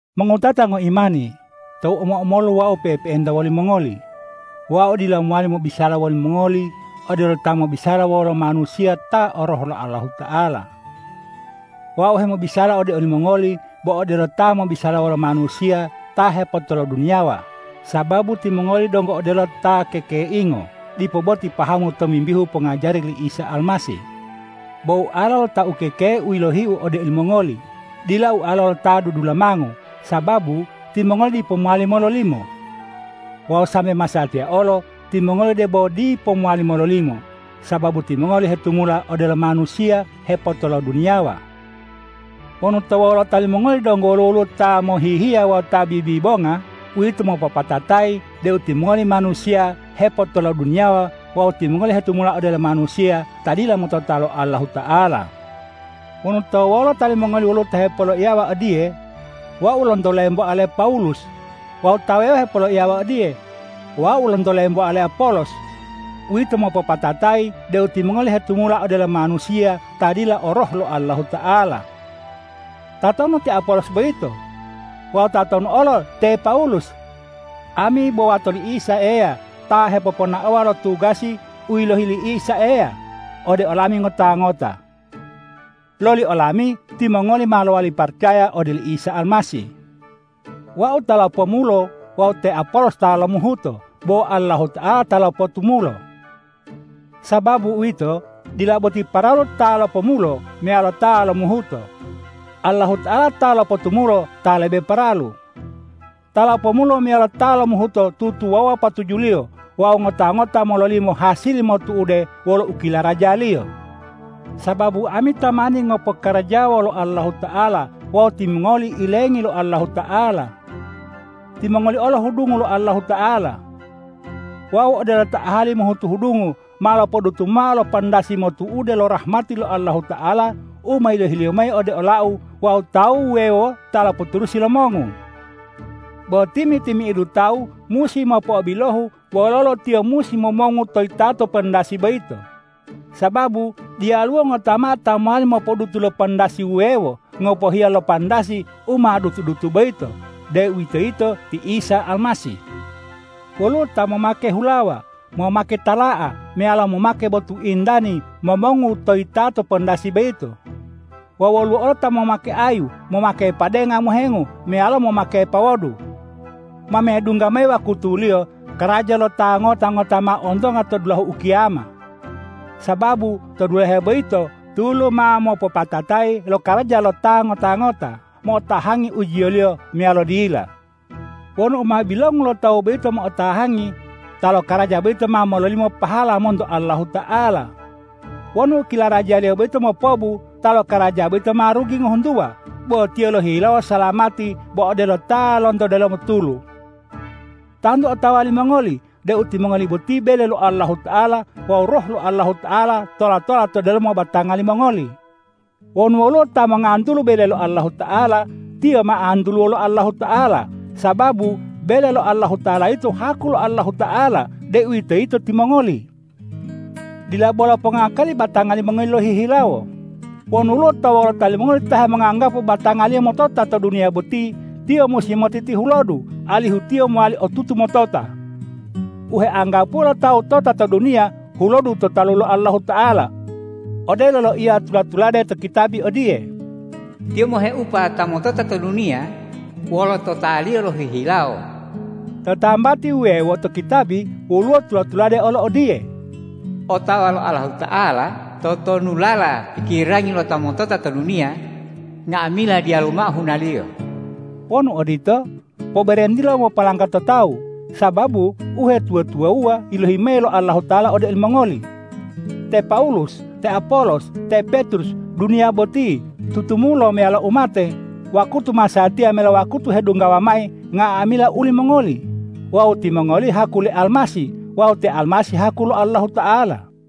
Mongowutata ngoimani, tou omo-omolu wau pe'epe'enta wolimongoli, wau dila mowali mobisala wolimongoli odelo ta mobisala wolo manusiya ta o Roh lo Allahuta'ala. Wau hemobisala ode olimongoli bo odelo ta mobisala wolo manusiya ta hepotoloduniyawa, sababu timongoli donggo odelo ta kekeingo dipo boti pahamu tomimbihu pongajari li Isa Almasih. Bo ualo lo ta ukekei u yilohiu ode olimongoli, dila ualo lo ta dudulamango, sababu timongoli dipo mowali mololimo. Wawu sambe masatiya olo, timongoli debo dipo mowali mololimo, sababu timongoli hetumula odelo manusiya hepotoloduniyawa. Wonu to wolota limongoli donggo woluwo ta mohihiya wawu ta bibibonga, uwito mopopatatayi deu timongoli manusiya hepotoloduniyawa wawu timongoli hetumula odelo manusiya ta dila motota lo Allahuta'ala. Wonu to wolota limongoli woluwo ta hepoloiyawa odiye,”Wau lonto lemboa le Pawulus” wawu ta wuwewo hepoloiyawa odiye,”Wau lonto lemboa le Apolos,” uwito mopopatatayi deu timongoli hetumula odelo manusiya ta dila o Roh lo Allahuta'ala. Tatonu te Apolos boyito? Wawu tatonu olo te Pawulus? Ami bo wato li Isa Eya ta hepoponaowa lo tugasi u yilohi li Isa Eya ode olami ngota-ngota. Loli olami timongoli ma lowali paracaya ode oli Isa Almasih. Wau ta lopomulo wawu te Apolos ta lomuhuto, bo Allahuta'ala ta lopotumulo. Sababu uwito, dila boti paralu ta lopomulo meyalo ta lomuhuto; Allahuta'ala ta lopotumulo ta lebe paralu. Ta lopomulo meyalo ta lomuhuto tutuwawuwa patujuliyo wawu ngota-ngota mololimo hasili motu'ude wolo u kilarajaliyo, sababu ami tamani ngopokarajawa wolo Allahuta'ala wawu timongoli ilengi lo Allahuta'ala. Timongoli olo hudungu lo Allahuta'ala. Wau odelo ta ahali mohutu hudungu ma lopodutu mao lo pandasi motu'ude lo rahmati lo Allahuta'ala u ma yilohi-Liyo mayi ode olau wawu tawu wuwewo ta lopoturusi lomongu. Bo timi-timi'idu tawu musi mopo'obilohu wololo tiyo musi momongu to yitato pandasi boyito. Sababu diyaluwo ngota mao ta mowali mopodutu lo pandasi wuwewo, ngopohiya lo pandasi u ma dutu-dutu boyito, deuwitoyito ti Isa Almasih. Woluwo ta momake hulawa, momake tala'a meyalo momake botu intani momongu to yitato pandasi boyito. Wawu woluwo olo ta momake ayu, momake padenga mohengu meyalo momake pawodu. Ma medungga mayi wakutuliyo, karaja lo ta ngota-ngota ma ontonga to dulahu ukiyama. Sababu to dulahe boyito tulu ma mopopatatayi lokaraja lo ta ngota-ngota mo'otahangi ujiyoliyo meyalo dila. Wonu u ma bilongu lo tawu boyito mo'otahangi, ta lokaraja boyito ma mololimo pahala monto Allahuta'ala. Wonu u kilarajaliyo boyito mopobu, ta lokaraja boyito ma rugi ngohuntuwa, bo tiyo lohihilawo salamati bo odelo ta lonto delomo tulu. Tantu otawa limongoli deu timongoli boti bele lo Allahuta'ala wawu Roh lo Allahuta'ala tola-tola to delomo batanga limongoli. Wonu woluwo ta mongantulu bele lo Allahuta'ala, tiyo ma antuluwo lo Allahuta'ala, sababu bele lo Allahuta'ala yito haku lo Allahuta'ala, deuwitoyito timongoli. Dila bolo pongakali batanga limongoli lohihilawo. Wonu woluwo to wolota limongoli ta hemonganggapu batangaliyo motota to duniya boti, tiyo musi motitihulodu, alihu tiyo mowali otutu motota. U heanggapuwo lo tawu tota to duniya, hulodu to talu lo Allahuta'ala. Odelo loiya tula-tulade to kitabi odiye,”Tiyo moheupa ta motota to duniya wolo totaliyo lohihilawo.” To tambati wuwewo to kitabi woluwo tula-tulade olo odiye,”Otawa lo Allahuta'ala totonulala pikirangi lo ta motota to duniya, nga'amila diyalu mao hunaliyo.” Wonu odito, poberentilo mopolanggato tawu, sababu uhetuwa-tuwawuwa yilohi mayi lo Allahuta'ala ode olimongoli: te Pawulus, te Apolos, te Petrus, duniya boti, tutumulo meyalo umate, wakutu masatiya meyalo wakutu hedunggawa mayi, nga'amila ulimongoli. Wawu timongoli haku le Almasih wawu te Almasih haku lo Allahuta'ala.